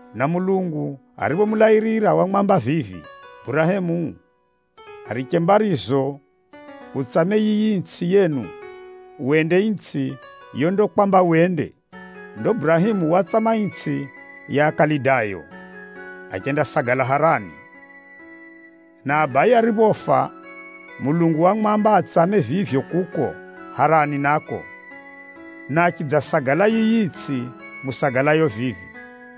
Na Mulungu ariphomulairira, wamwamba vivi, ‘Ariche mbarizo utsame yiyi itsʼi yenu, wende itsʼi yondakwamba wende.’ Ndo Burahemu watsama itsʼi ya Akalidayo, achendasagala Harani. Na abaye ariphofa, Mulungu wamwamba atsame vivyo kuko Harani nako, na achidzasagala yiyi itsʼi musagalayo vivi.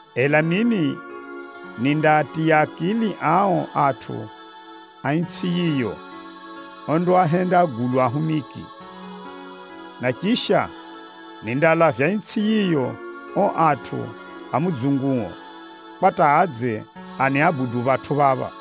Ela mimi, nindaatiya akili ao atʼu a itsʼi yiyo ondaahenda agulwa ahumiki. Na chisha, andalaa itsʼi yiyo ao atʼu a mudzunguo, kwa hata adze aniabudu phatʼu phapha.’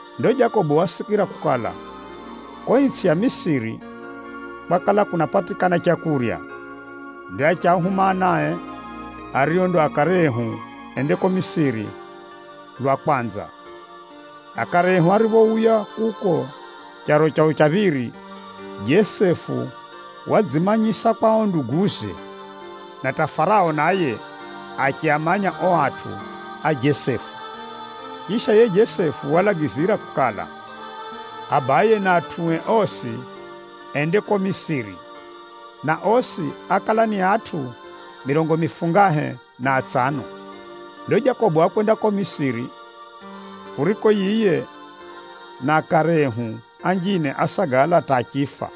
Ndo Jakobo wasikira kukala, kuko itsʼi ya Misiri, kwakala kunapatikana leu. Ndo achiahuma anae, ario ndo akare ehu ende kuko Misiri lwa kwanza. Akare ehu ariphouya kuko charo chao cha phiri, Jesefu wadzimanyisa kwa ao nduguze, na hata Farao naye achiamanya ao atʼu a Jesefu. Chisha, yiye Jesefu walagizira kukala, abaye na atʼue osi ende kuko Misiri, na osi ákala ni atʼu mirongo mifungahe na atsano. Ndo Jakobo wakwenda kuko Misiri, kuriko yiye na akare ehu anjine ásagala hata achifa,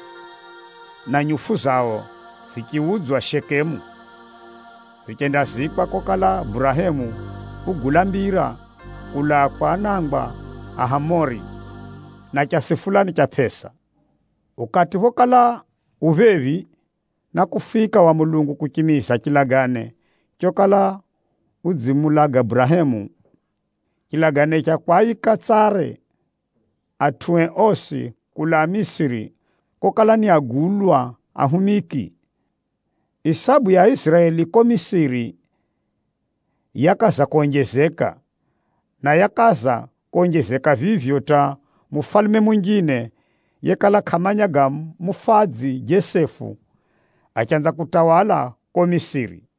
na nyufu zao zichiudzwa Shekemu zichendazikwa kokala Burahemu ugula mbira kulaa kwa anangwa a Hamori, na chasi fulani cha pʼesa. “Ukati phokala u phephi na kufika wa Mulungu kuchimiza chilagane chokala udzimulaga Burahemu, chilagane cha kwaika tsare atʼue osi kulaa Misiri kokala ni agulwa ahumiki, isabu ya Aiziraeli kuko Misiri yakaza konjezeka. Na yakaza konjezeka vivyo hata mufalume munjine ariye kʼamumanyire Jesefu, achanza kutawala kuko Misiri.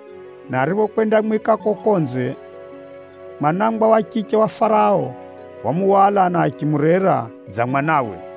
na ariphokwendamwika kuko konze, mwanangwa wa chiche wa Farao wamuhwala na achimurera dza mwanawe.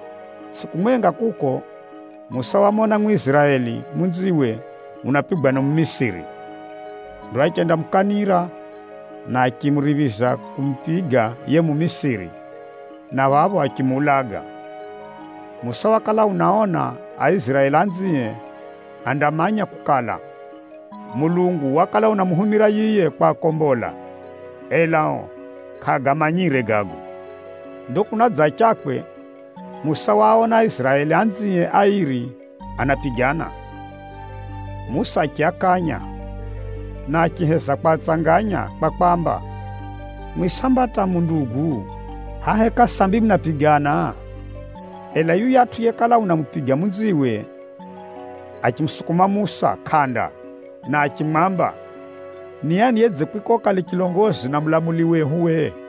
Tsʼiku mwenga kuko, Musa wamona Mwiziraeli munziwe unapigwa ni Mumisiri. Ndo achendamukanira, na achimuriphiza kumupiga yiye Mumisiri, na phapho achimuulaga. Musa wakala unaona Aiziraeli anzie andamanya kukala, Mulungu wakala unamuhumira yiye kwakombola, ela ao kʼaagamanyire gago. Ndo kunadzachakwe, Musa waona Aiziraeli anzie airi anapigana. Musa achiakanya, na achiheza kwatsanganya kwa kwaamba, ‘Mwimwi samba hata mu ndugu! Hʼaya heka sambi munapigana?’ Ela yuyatʼu yekala unamupiga munziwe, achimusukuma Musa kʼanda, na achimwamba, ‘Ni ani yekwika uwe ukale chilongozi na mulamuli wehu?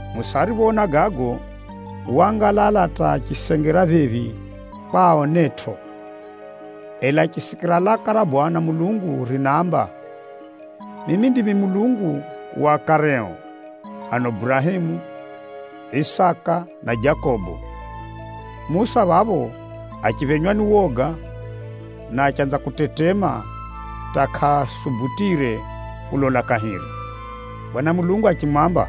Musa ariphoona gago, waangalala hata achisengera phephi kwa aonetʼo. Ela achisikira laka ra Bwana Mulungu rinaamba, ‘Mimi ndimi Mulungu wa akareo, ano Burahemu, Isaka na Jakobo!’ Musa phapho achiphenywa ni woga, na achanza kutetema hata kʼasubutire kulola kahiri. Bwana Mulungu achimwamba,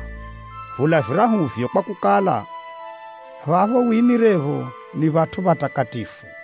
‘Vula virahuvyo kwakukala, phapho wimirepho ni phatʼu phatakatifu.’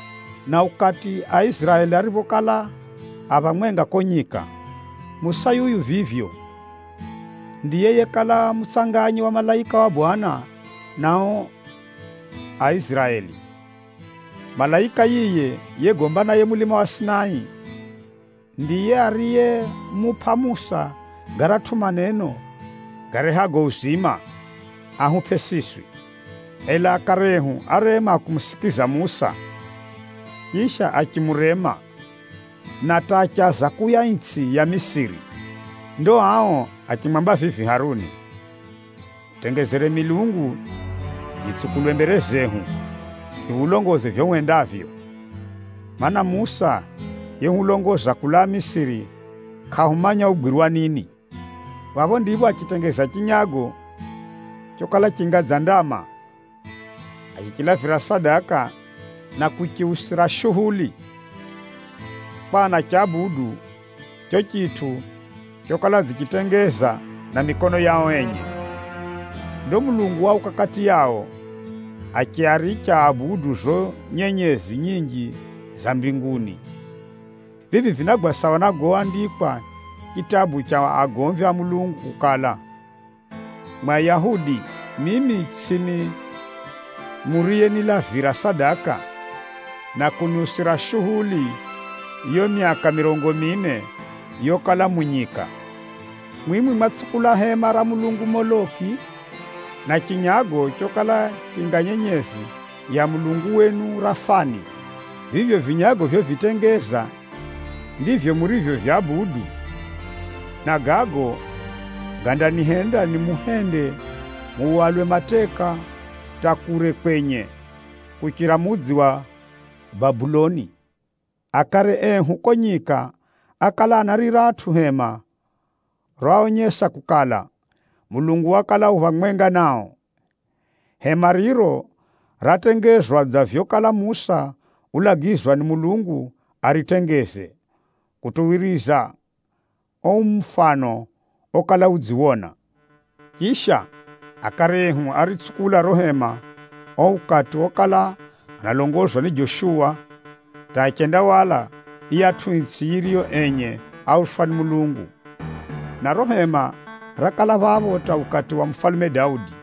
Na ukati Aiziraeli ariphokala a phamwenga kuko nyika, Musa yuyu vivyo, ndiye yekala mutsanganyi wa malaika wa Bwana na ao Aiziraeli. Malaika yiye yegomba naye mulima wa Sinai, ndiye ariyemupʼa Musa garatʼu maneno garehago uzima, ahupʼe siswi. “Ela akare ehu árema kumusikiza Musa, chisha achimurema, na hata achaza kuuya itsʼi ya Misiri. Ndo ao achimwamba vivi Haruni, ‘Hutengezere milungu, yitsukulwe mbere zehu, yihulongoze vivyo hwendavyo. Maana, Musa yehulongoza kulaa Misiri, kʼahumanya ugwirwa nini!’ Phapho ndipho achitengeza chinyago chokala chinga dza ndama. Achichilavira sadaka na kuchiusira shuhuli kwa anachabudu chicho chitʼu chokala adzichitengeza na mikono yao enye. Ndo Mulungu wauka kati yao, achiaricha aabudu zizo nyenyezi nyinji za mbinguni. Vivi vinagwa sawa na goandikwa chitabu cha agomvi a Mulungu kukala, ‘Mwimwi Ayahudi, mimi tsʼimi muriyenilavira sadaka na kuniusira shuhuli yiyo myaka mirongo mine yokala mu nyika. Mwimwi mwatsukula hema ra mulungu Moloki, na chinyago chokala chinga nyenyezi ya mulungu wenu Rafani. Vivyo vinyago vyovitengeza, ndivyo murivyovyabudu, na gago gandanihenda nimuhende muhwalwe mateka muphirikwe kutʼu kure kuchira mudzi wa Babeli.’ “Akare ehu kuko nyika ákala ana riratʼu hema roaonyesa kukala, Mulungu wakala u phamwenga nao. Hema riro ratengezwa dza vyokala Musa ulagizwa ni Mulungu aritengeze, kutuwiriza ao mufano okala udziwona. Chisha, akare ehu áritsukula riro hema ao ukati okala analongozwa ni Joshuwa hata achendahwala yiyatʼu itsʼi yiriyo enye áuswa ni Mulungu. Na riro hema rakala phapho hata ukati wa mufalume Daudi.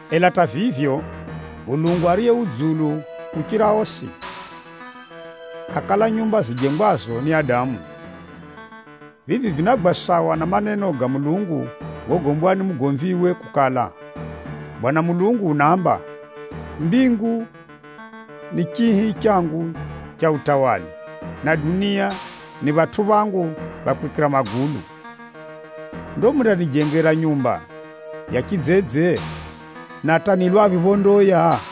Ela hata vivyo, Mulungu Ariye Dzulu kuchira osi, kʼakala nyumba zijengwazo ni adamu. Vivi vinagwa sawa na maneno ga Mulungu gogombwa ni mugomviwe kukala, ‘Bwana Mulungu unaamba, “Mbingu ni chihi changu cha chifalume, na itsʼi ni phatʼu phangu pha kwikira magulu. Ndo mundanijengera nyumba ya chidzedze? Na hata ni lwaphi phondaoya?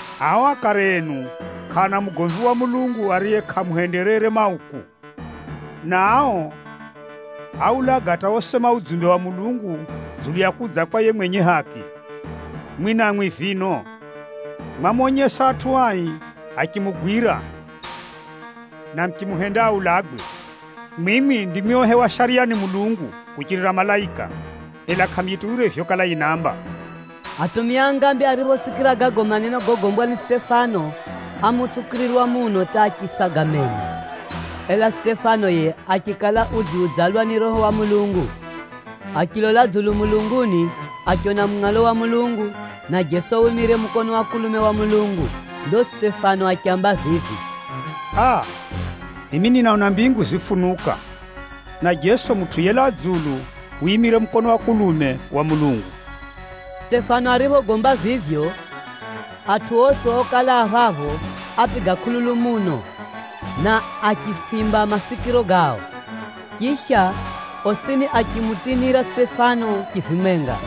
Ao akare enu kʼaana mugomvi wa Mulungu ariye kʼaamuhenderere mauku. Na ao áaulaga hata osema udzumbe wa Mulungu dzulu ya kudza kwa yiye mwenye haki. Mwimwi namwi vino, mwamonyesa atʼu ai achimugwira, na muchimuhenda aulagwe. Mwimwi ndimwi ohewa Shariya ni Mulungu kuchirira malaika, ela kʼamuyituwire vyokala yinaamba!” Atumia a ngambi ariphosikira gago maneno gogombwa ni Sitefano, ámutsukirirwa muno hata achisaga meno. Ela Sitefano yiye achikala udziudzalwa ni Roho wa Mulungu. Achilola dzulu mulunguni achiona mungʼalo wa Mulungu, na Jeso wimire mukono wa kulume wa Mulungu. Ndo Sitefano achiamba vivi, “Aa! Mimi ninaona mbingu zifunuka, na Jeso Mutʼu yelaa dzulu wimire mukono wa kulume wa Mulungu.” Sitefano ariphogomba vivyo, atʼu osi okala a phapho, ápiga kʼululu muno, na achifimba masikiro gao. Chisha, osini achimutinira Sitefano chivimwenga,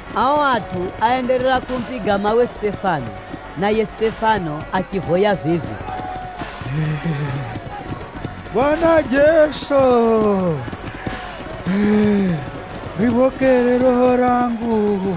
Ao atʼu áenderera kumupiga mawe Sitefano, na yiye Sitefano achivoya vivi, “Bwana Jeso, riphokere roho rangu!”